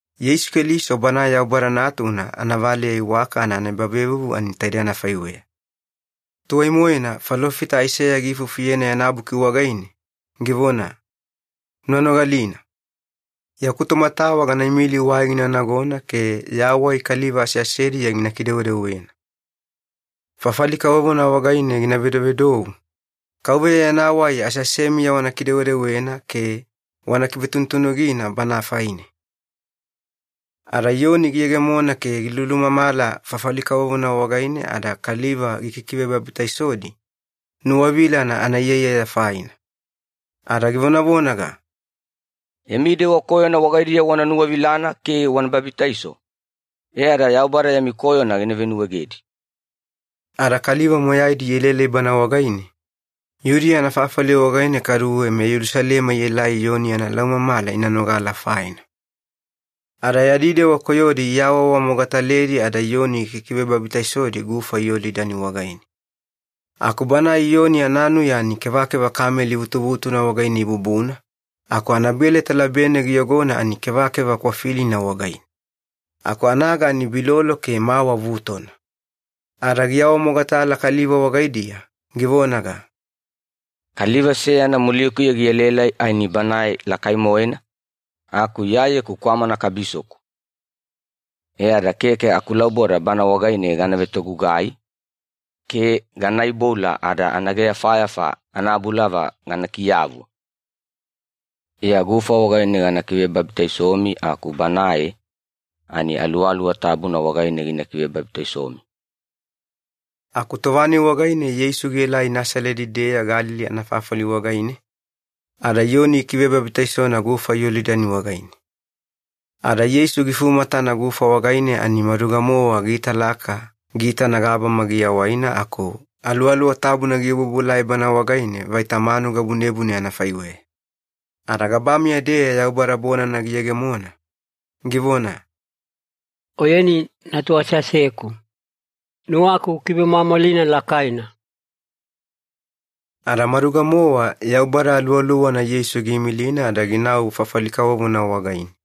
Yeisu Keliso Banae Yaubada Natuna anavaleya iwakana anaebavevuvu ani taidei anafaiweya. Tuwai-moena falofita Aiseya giifufuyena yana buki wagaine, givona, “Una nogalina. Yaku tomatawa gana imili wai gina nagona ke ya wai kaliva aseasediya gina kidewedewena. Fafali kavovona wagaine gina vedovedou, ‘KAUVEYA yana wai aseasemiya wana kidewedewena ke wana kivetunutunugina Bana faine.’” Ada Iyoni giyegemona ke gilulumamala fafali kavovona wagaine ada kaliva gikikivebabitaisodi, nuwavilana anaiyaiyaya faina. Ada givonavonaga, “Yami dewa koyona wagaidiya wana nuwavilana ke wana babitaiso e ada Yaubada yami koyona gina venuwaegedi.” Ada kaliva moyaidi ielaelai bana wagaine, Yudiya anafafali wagaine kaduwe meYelusalema ielai Iyoni yana laumamala ina nogala faina. Ada yadi dewa koyodi iawaawamogataledi, ada Iyoni gikivebabitaisodi gufa Yolidani wagaine. Aku banae Iyoni ananuya ani kevakeva kameli vutuvutuna wagaine ibubuna, aku anabeleta labene giyogona ani kevakeva kwafilina wagaine. Aku anaga ani bilolo ke mawa vutona. Ada giawamogatala kaliva wagaidiya, givonaga, “Kaliva seyana mulikuya gielaelai ani Banae lakai-moena, aku Iyayeku kwamana kabisoku. E ada keke akulauboda Bana wagaine gana vetogugai ke gana iboula ada anaageyafayafa anabulava gana kiyavu. Iya gufa wagaine gakivebabitaisomi aku Banae, ani Aluwaluwa Tabuna wagaine gina kivebabitaisomi.” Aku tova-nai wagaine Yeisu gielai Nasaledi-deya Galili anafafali wagaine, ada Iyoni gikivebabitaisona gufa Yolidani wagaine. Ada Yeisu gifumatana gufa wagaine ani maduga-mowa giitalaka giitana gabama giawaina aku Aluwaluwa Tabuna giobuobuelai Bana wagaine vaita manuga bunebune anafaiweya. Ada gabameya-deya Yaubada bonana giyegemona, givona, “Oyeni Natu aseaseku. Nuwaku ukivemwamwalina lakaina.” Ada maduga-mowa Yaubada Aluwaluwana Yeisu giimilina ada ginau fafali kavovona wagaine.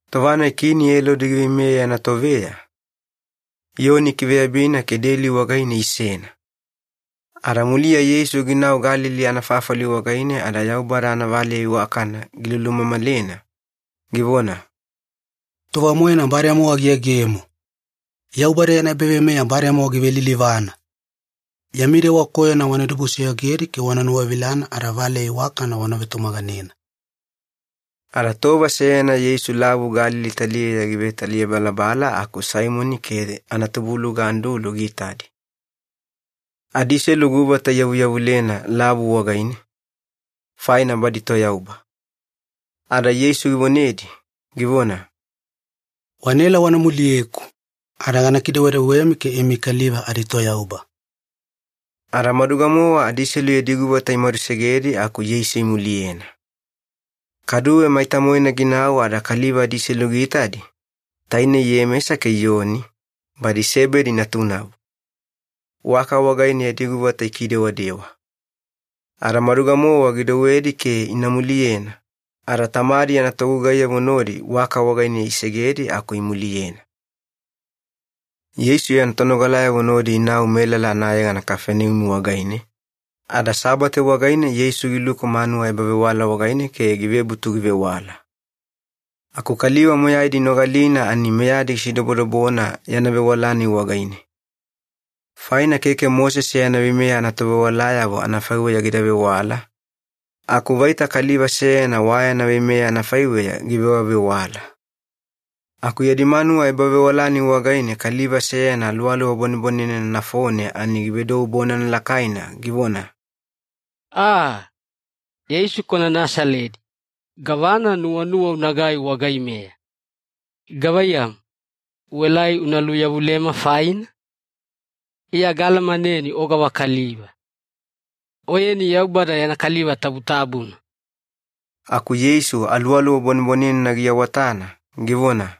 Tova-nai Kini Elodi giveimeya yana toveya, Iyoni ikiveyabina ke deli wagaine isena. Ada muliya Yeisu ginau Galili anafafali wagaine ada Yaubada anavaleya iwakana gilulumamalena, givona, “Tova-moena bademowa giyegemo! Yaubada yana ebaveimeya bademowa givelilivana. Yami dewa koyona wana dibusoyogedi ke wana nuwavilana, ada valeya iwakana wana vetumaganena.” Ada tova seyana Yeisu Lavu Galili taliyeya givetaliyabalabala aku Saimoni ke anatubuluga Andulu giitadi. Adiselu guvata iyavuyavulena lavu wagaine, faina badi toyauba. Ada Yeisu givonedi, givona, “Wanaela wana muliyeku ada gana kidewedewemi ke imi kaliva aditoyauba.” Ada maduga-mowa adiselu yadi guvata imadusegedi aku Yeisu imuliyena. Kaduwe maita-moena ginau ada kaliva adiselu giitadi, tainei Iyemesa ke Iyoni, badi Sebedi natunavo. Waka wagaine yadi guvata ikidewadewa. Ada maduga-mowa gidouwedi ke ina muliyena, ada tamadi yana togugaiyavo nodi waka wagaine isegedi aku imuliyena. Yeisu yana tonogalayavo nodi inau melala anayegana Kafaneumi wagaine, ada Sabate wagaine Yeisu giluku manuwa ebavewala wagaine ke givebutu givewala. Aku kaliva moyaidi inogalina ani meyadi gisidobodobona yana vewala-nai wagaine. Faina keke Mosese yana veimeya anatovewalayavo anafaiweya gida vewala, aku vaita kaliva seyana wa yana veimeya anafaiweya givewavewala. Aku yadi manuwa ebavewala-nai wagaine kaliva seyana aluwaluwa bwanebwanenena nafone ani givedou bonana lakaina, givona, “Aa! Yeisu kwana Nasaledi, gavana nuwanuwa unagai wagaimeya? Gavaiyamu, uelai una luyavulema faina? Iya gaalamaneni o gavakaliva. Oyeni Yaubada yana Kaliva Tabutabuna!” Aku Yeisu aluwaluwa bwanebwanenena giawatana, givona,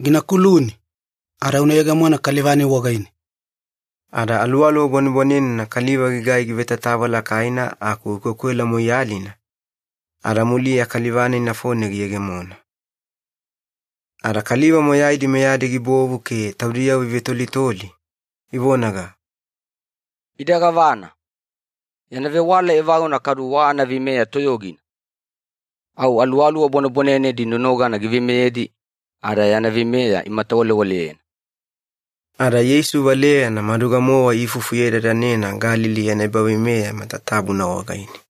“Gina kuluni, ada una yegemona kaliva-nai wagaine!” Ada aluwaluwa bwanebwanenena kaliva gigai givetatava lakaina aku gikwekwela moiyalina, ada muliya kaliva-nai nafone giyegemona. Ada kaliva moyaidi meyadi gibovu ke taudiyavo ivetolitoli, ivonaga, “Ida gavana? Yana vewala evaguna kadu wa anaveimeya toyogina! Au aluwaluwa bwanebwanenedi nonogana giveimeyedi ada yana veimeya imatawalewaleyena.” Ada Yeisu valeyana maduga-mowa iifufuyedadanena Galili yana ebaveimeya matatabuna wagaine.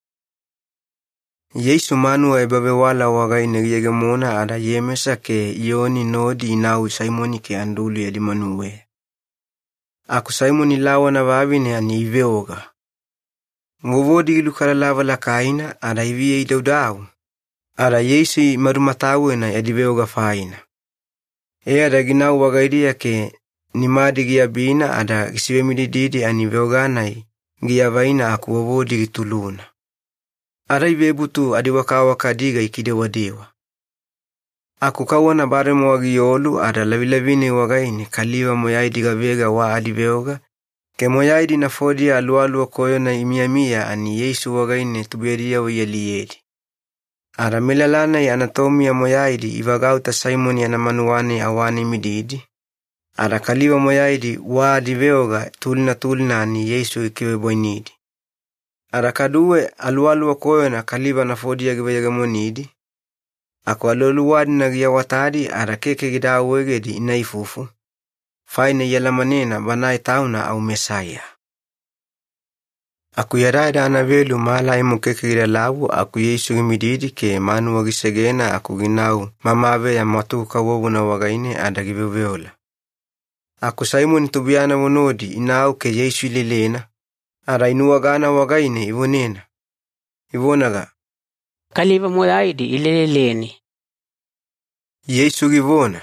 Yeisu manuwa ebavewala wagaine giyegemona ada Iyemesa ke Iyoni nodi inau Saimoni ke Andulu yadi manuweya. Aku Saimoni lawana vavine ani iveoga. Vovodi gilukalalava lakaina ada iviya idaudau, ada Yeisu imadumatawena yadi veoga faina. E ada ginau wagaidiya ke nimadi giabina ada gisivemidididi ani veoga-nai giavaina aku vovodi gituluna. Ada ivebutu adiwakawaka adiga ikidewadewa. Aku kauwana bademowa giolu ada lavilavi-nai wagaine kaliva moyaidi gavega wa adiveoga ke moyaidi nafodiya aluwaluwa koyona imiyamiya ani Yeisu wagaine tubuiyadiyavo ialiyedi. Ada melala-nai anatomiya moyaidi ivagauta Saimoni yana manuwa-nai awane imididi, ada kaliva moyaidi wa adiveoga tulina tulina ani Yeisu gikivebwainidi. Ada kaduwe aluwaluwa koyona kaliva nafodiya giveyegemonidi, aku aluwaluwa-dina giawatadi ada keke gida awaegedi ina ifufu, faina ialamanena Banae Tauna au Mesaiya. Aku yadayada anavelu mala aimo keke gidalavu aku Yeisu gimididi ke manuwa gisegena aku ginau mamaveya mwatugu-kavovona wagaine ada giveoveola. Aku Saimoni tubuiyanavo nodi inau ke Yeisu ilelena, ada inuwagana wagaine ivonena, ivonaga, “Kaliva moyaidi ileleleni.” Yeisu givona,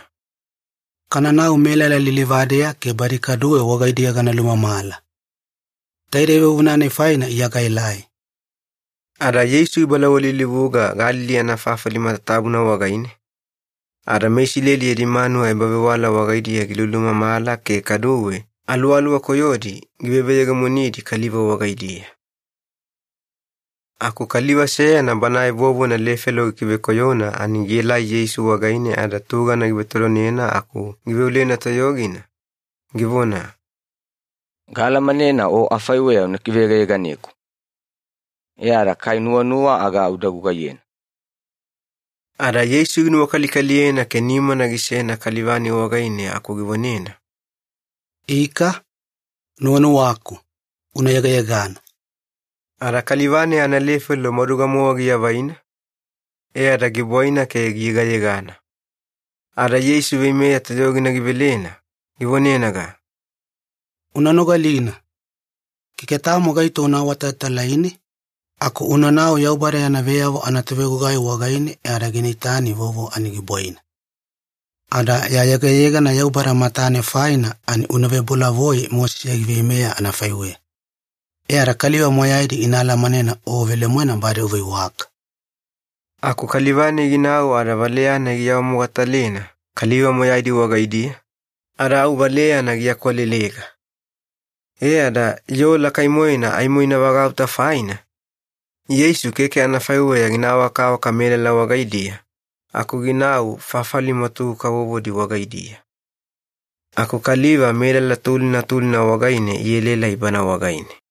“Kananau melala lilivadeya ke badi kaduwe wagaidiya gana lulumamala. Taide vuvuna-nai faina Iya gaelai.” Ada Yeisu gibalawalilivuga Galili anafafali matatabuna wagaine, ada meIsileli yadi manuwa ebavewala wagaidiya gilulumamala ke kaduwe aluwaluwa koyodi giveveyegemonidi kaliva wagaidiya. Aku kaliva seyana banae vovona lefelo gikivekoyona ani gielai Yeisu wagaine ada tugana givetodonena aku giveolena toyogina, givona, “Gaalamanena O afaiweya una kiveyegayeganeku. E ada kai nuwanuwa aga uda gugaiyena.” Ada Yeisu ginuwakalikaliyena ke nimana gisena kaliva-nai wagaine aku givonena, “Ika, nuwanuwaku. Una yegayegana.” Ada kaliva-nai analefelo maduga-mowa giavaina, e ada gibwaina ke giyegayegana. Ada Yeisu veimeya toyogina givelena, givonenaga, “Una nogalina. Keke tamo gaito una awatalatalaine, aku unanau Yaubada yana veyavo anatovegugai wagaine e ada gina itani vovo ani gibwaina. Ada ya yegayegana Yaubada matane faina ani una vebolavoi Mosese giveimeya anafaiweya. E ada kaliva moyaidi ina alamanena o velemoena bade uveiwaka.” Aku kaliva-nai ginau ada valeya-nai giawamogatalena kaliva moyaidi wagaidiya, ada au valeyana giakwalelega. E ada yoo lakai-moena aimo ina vagauta faina, Yeisu keke anafaiweya gina awakawaka melala wagaidiya aku ginau fafali mwatugu kavovodi wagaidiya. Aku kaliva melala tulina tulina wagaine ielaelai Bana wagaine.